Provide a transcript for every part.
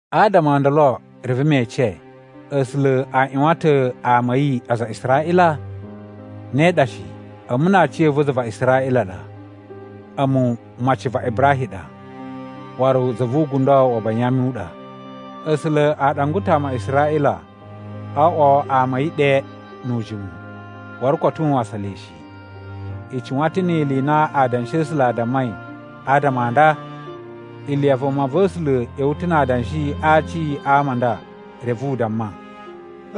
Adama o ndolo reve me ece: A̱sula̱ a ꞌyuwan ta̱ ama a̱ yi, aza a Israꞌila? Ne ɗa shi! A̱mu na aciya̱va̱ za va Israꞌila ɗa. A̱mu maci va Ibrahim ɗa, waru za vu ugundo wa Banyami u ɗa. A̱sula̱ a ɗangwa ta̱ ama a Israꞌila o oꞌwo ama a̱ yi ɗe nu ujimu, waru koto u wasan le shi. I cuwan ta̱ ni ili i na Adanshi a̱ A̱sula̱ a dammai adama a nda? Iliya vumava̱sula̱ ꞌya̱wa̱ ta̱ na adanshi a aci a ama a nda reve u damma,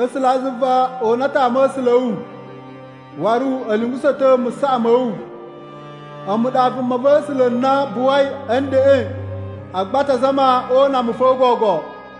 “A̱sulazuva, o una ta̱ ama̱sula̱ a̱ wu, waru a̱ lungusa̱ ta̱ musaꞌa ma̱ wu. A̱mu ɗa vumava̱sula̱ na buwai a̱ ndeꞌen, agba a ta zama o una mu fo gogo.”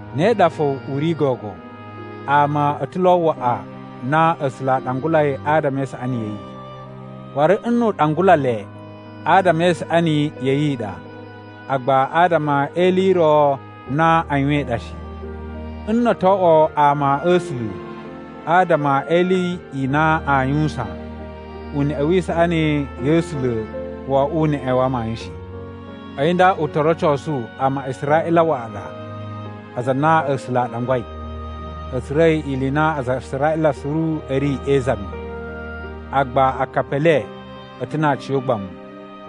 Ne ɗa fo u ri gogo. Ama a̱ ta̱ lo waꞌa na A̱sula̱ a ɗangulai adama e isaꞌani ya̱ yi. Waru nnu u ɗangula le, adama e isaꞌani ya̱ yi i ɗa, agba adama e ili i ro na a yuwain ɗa shi. Nno o to oꞌwo ama a̱ A̱sula̱ adama e ili i na aa yuwusan, uneꞌe wi isaꞌani ya̱ A̱sula̱ wo oꞌwo uneꞌe wa amayun shi. A̱yi nda u to rocosu ama a Israꞌila waꞌa ɗa, aza a na A̱sula̱ a ɗangwai, a̱ tsura̱i ili i na aza a Israꞌila suru a̱ ri e izami. Agba akapi e le a̱ ta̱ na aciyogbamu.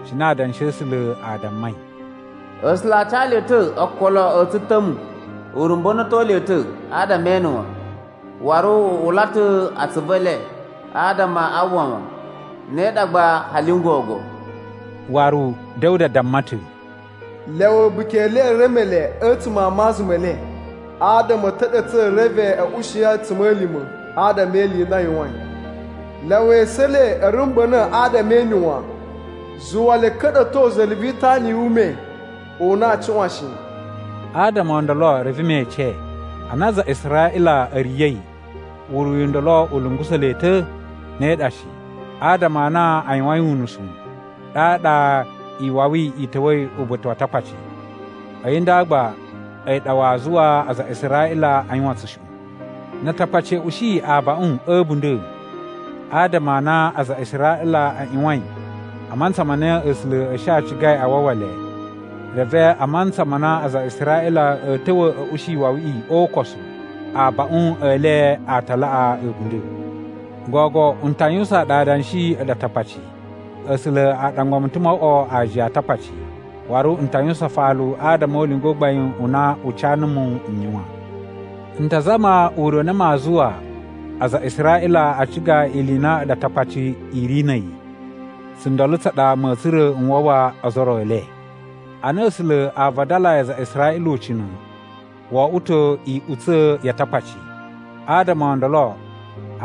Cine Adanshi a̱ A̱sula̱ a dammai: “A̱sula̱ a ca le ta̱ okolo a̱ tsuta̱mu. U rumba̱na̱to le ta̱ adama e ene wan, waru u ula ta̱ atsuvu e le adama a uwwa wan. Ne ɗa gba hali n gogo.” Waru Da̱wuda damma ta̱: “Lyawa a̱buki e le e reme le a̱tsuma̱ a maza me le, adama a̱ ta̱ɗa̱tsa̱ reve a̱ ushi a̱tsuma̱lima̱ adama e ili i na a yuwain. Lyawa esu e le a̱ rumba̱na̱ adama e ene wan, zuwa le a̱ ka̱ɗa̱to za̱la̱ vi itana yu ume u na aa cuꞌwan shi.” Adama o ndolo reve me ece: Ana aza a Israꞌila a̱ riya̱i, uriyu u ndolo u lungusa̱ le ta̱? Ne ɗa shi! Adama a na a yuwain unusu, ɗaɗa iwawi i ta̱wa̱i uba̱ta̱ wa Atakpaci, a̱yi nda gba a̱yi ɗa waa zuwa aza a Israꞌila a yuwan tsushuꞌun. Na Atakpaci a̱ ushi abaꞌun a̱ a̱bunda̱ adama a na aza a Israꞌila a ꞌyuwain a mantsa ma na A̱sula̱ a̱ shi a cigai a wawa le, reve a mantsa ma na aza a Israꞌila a̱ ta̱wa̱ a̱ ushi iwawiꞌi o ukosu, abaꞌun e le a ta laꞌa a̱bunda̱. Gogo n ta yuwusaan ɗu adanshi a̱ɗu Atakpaci. A̱sula̱ a ɗangwa mu ta̱ mo oꞌwo aajiya a Atakpaci, waru n ta yuwusan afalu adama o ulinga u gbain u na u ca numu n yuwan. N ta zama ure u na maa zuwa aza a Israꞌila a ciga ili i na a̱ɗu Atakpaci i ri na̱ a̱yi, tsundolo tsa ɗa ma̱a̱ tsura̱ n wawa ozo o ro e le. Ana A̱sula̱ a vadalayi aza a Israꞌila ucina̱, wo oꞌwo ta̱ iꞌutsa̱ ya Atakpaci. Adama o ndolo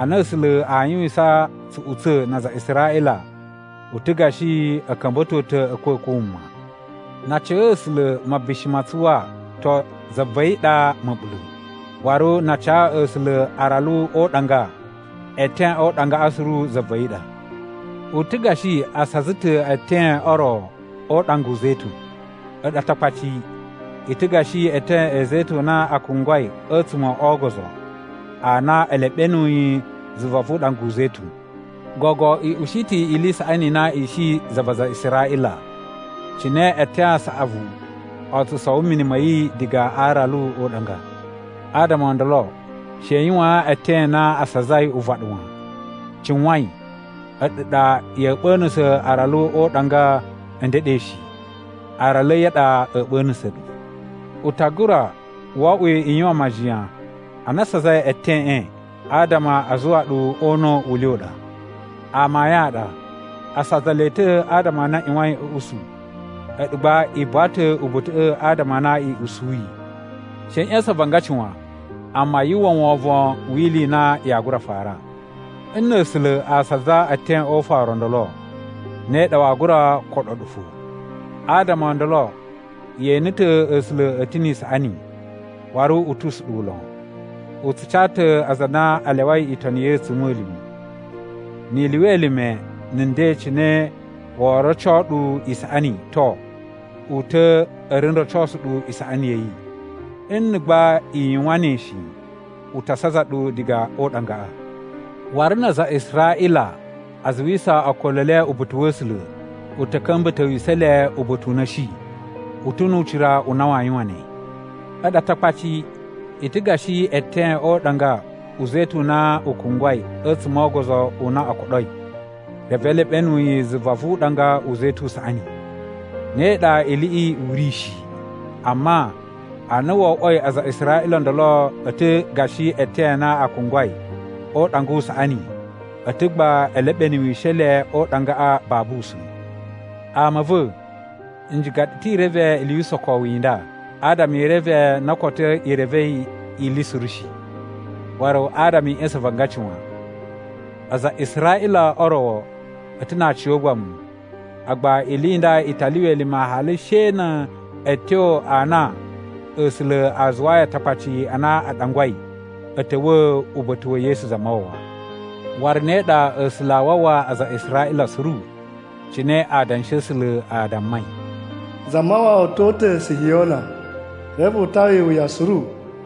ana A̱sula̱ aa yuwisan tsuꞌutsa̱ na aza a Israꞌila, u ta̱ gashi a̱ ka̱mba̱to ta̱ a̱a̱kwa̱kwa̱ wuma. Na a ca A̱sula̱ mabishi ma tsuwa, to, za va̱ yi ɗa ma̱ɓula̱. Waru na a ca A̱sula̱ aralu o uɗanga, eten o uɗangaꞌa suru za va̱ yi ɗa. U ta̱ gashi a saza ta̱ eten o ro o uɗanga u zetun. A̱ɗu Atakpaci i ta̱ gashi eeten e zetun a na a kungwai a̱tsuma̱ o ogozo a na e leɓenuyi zuva vu uɗanga u zetun. Gogo i ushi ta̱ ili i saꞌani i na i shi za va aza a Israꞌila cine eeten a saꞌavu o tsu sowo mini ma̱ yi diga a aralu o uɗanga. Adama o ndolo she i yuwaan eten a na a sazai uvaɗu wan. Cuwain, a̱ɗu ɗa ya̱a̱ ɓa̱na̱sa̱ aralu o uɗanga a̱ ndeɗe shi. Aralu a̱ yi a ɗa a̱ ɓa̱na̱sa̱ ɗu. U ta gura wo oꞌwo i yuwan majiyan a na a sazai eteꞌen, adama a zuwa ɗu o una̱ u le u ɗa. Amayun a ɗa. A saza le ta̱ adama a na a ꞌyuwain a̱ usu, a̱ɗu gba i buwa ta̱ uba̱ta̱ꞌa̱ adama a na i usuyi. She i ꞌya̱sa̱n avangaci wan, amma yu uwwa wovon wi ili i na yaa gura fara. Nna̱ A̱sula̱ a saza eten o ufaru o ndolo, ne ɗa waa gura koɗo ɗu fo. Adama o ndolo ye ene ta̱ A̱sula̱ a̱ ta̱ ni isaꞌani, waru u tu usuɗuwu lon. U tsu ca ta̱ aza a na a lyawai itoni ya̱ yi a̱tsuma̱lima̱. Ni i lyuwa elime na̱ nden cine woo roco ɗu isaꞌani, to, u ta̱ a̱ ri n rocosu ɗu isaꞌani ya̱ yi. Nna̱ gba i yuwan ne shi, u ta saza ɗu diga o uɗangaꞌa. Waru na aza a Israꞌila a zuwisa okolo e le uba̱ta̱ wa̱ A̱sula̱, u ta̱ ka̱mba̱towisa̱ le uba̱ta̱ u na a̱ shi. U ta̱ nu ucira u na waa yuwan ne. A̱ɗu Atakpaci i ta̱ gashi eeten o uɗanga u zetun u na u kungwai a̱tsuma̱ ogozo u na o koɗoi, reve e leɓenu yi zuva vu uɗanga u zetun u saꞌani. Ne ɗa iliꞌi u ri shi! Amma a na wo oꞌwoi aza a Israꞌila o ndolo a̱ ta̱ gashi eeten a na a kungwai o uɗanga u saꞌani, a̱ ta̱ gba e leɓenuwishe le o uɗangaꞌa babu usa̱n. Ama a̱ va̱, n ciga ɗu ta̱ i reve ili yu usokowu i nda, adama i reve na koto i revei ili suru shi, waru adama i ꞌya̱sa̱n avangaci wan. Aza a Israꞌila o ro a̱ ta̱ na aciyogbamu, agba ili i nda i ta lyuwa elime hali she na̱ a̱tyo a na A̱sula̱ a zuwayi Atakpaci a na a ɗangwai, a̱ ta̱wa̱ uba̱ta̱ wa̱ Yesu Zamawawa. Waru ne ɗa A̱sula̱ aa wawa aza a Israꞌila suru. Cine Adanshi a̱ A̱sula̱ a dammai: “Zamawawa to uta̱ Sihiyona, reve u tawa iwuya suru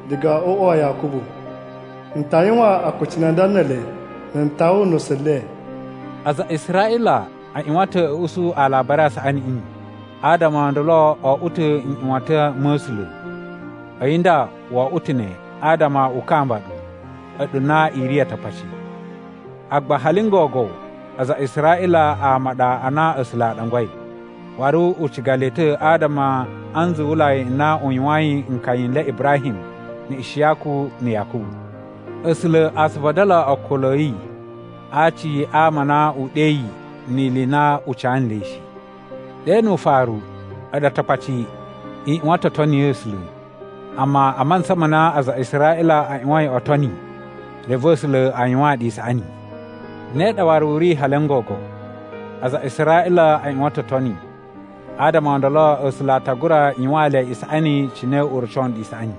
diga o uꞌwa wa Yakubu. N ta yuwan akucunu a nda ne ele na̱ n tawa nusu le.” Aza a Israꞌila a ꞌyuwan ta̱ a̱ usu Alabari a Saꞌaniꞌi, adama o ndolo o oꞌwo ta̱ nꞌyuwatan ma̱ A̱sula̱. A̱yi nda wo oꞌwo ta̱ ne adama u kamba ɗu, a̱ɗu na i ri Atakpaci. Agba hali n gogo aza a Israꞌila ama a ɗa a na A̱sula̱ a ɗangwai, waru u ciga le ta̱ adama a nzuwulai n na u yuwayin nkaya n le Ibrahim, na̱ Ishiyaku na̱ Yakubu. A̱sula̱ a tsu vadala okolo a̱ yi a aci a ama a na u ɗeyi ni ili i na u ca nle shi. Ɗe nu ufaru a̱ɗu Atakpaci i ꞌyuwan ta̱ o toni A̱sula̱. Amma a mantsa ma na aza a Israꞌila a ꞌyuwain o toni, reve A̱sula̱ a yuwaan ɗu isaꞌani. Ne ɗa waru u ri hali n gogo, aza a Israꞌila a ꞌyuwan ta̱ o toni, adama o ndolo A̱sula̱ a ta gura yuwaan le isaꞌani cine u roco nɗu isaꞌani.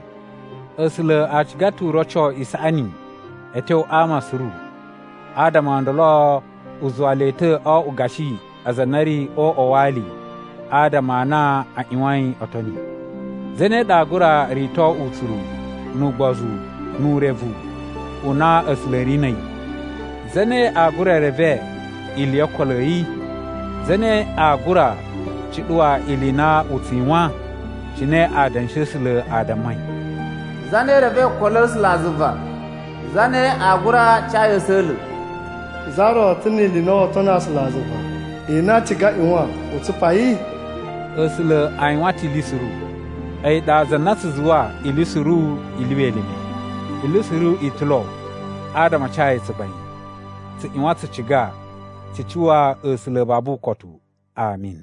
A̱sula̱ a ciga ta̱ u roco isaꞌani a̱ tyo a ama suru adama o ndolo u zuwa le ta̱ o oꞌwo gashi aza a na a̱ ri o uꞌwa wa ali adama a na a ꞌyuwain o toni. Zane ɗa aa gura rito utsuru, nu ugbozu, nu urevu u na A̱sula̱ a̱ ri na̱ a̱yi? Zane aa gura reve ili yo okolo a̱ yi? Zane aa gura cuɗuwa ili i na u tsu yuwan? Cine Adanshi a̱ A̱sula̱ a dammai, “Zane revei okolo a̱ A̱sulazuva? Zane aa gura ca yi a̱sa̱la̱?” “Za ro ta̱ ni ili i na woo tono A̱sulazuva, i na a ciga a ꞌyuwan u tsupa yi?” A̱sula̱ a yuwan ta̱ ili suru. A̱yi ɗa za na tsu zuwa ili suru i lyuwa elime. Ili suru i ta̱ lo adama a ca yi tsugbain. Tsu ꞌyuwan tsu ciga tsu cuwa A̱sula̱ babu ukotu! Ami.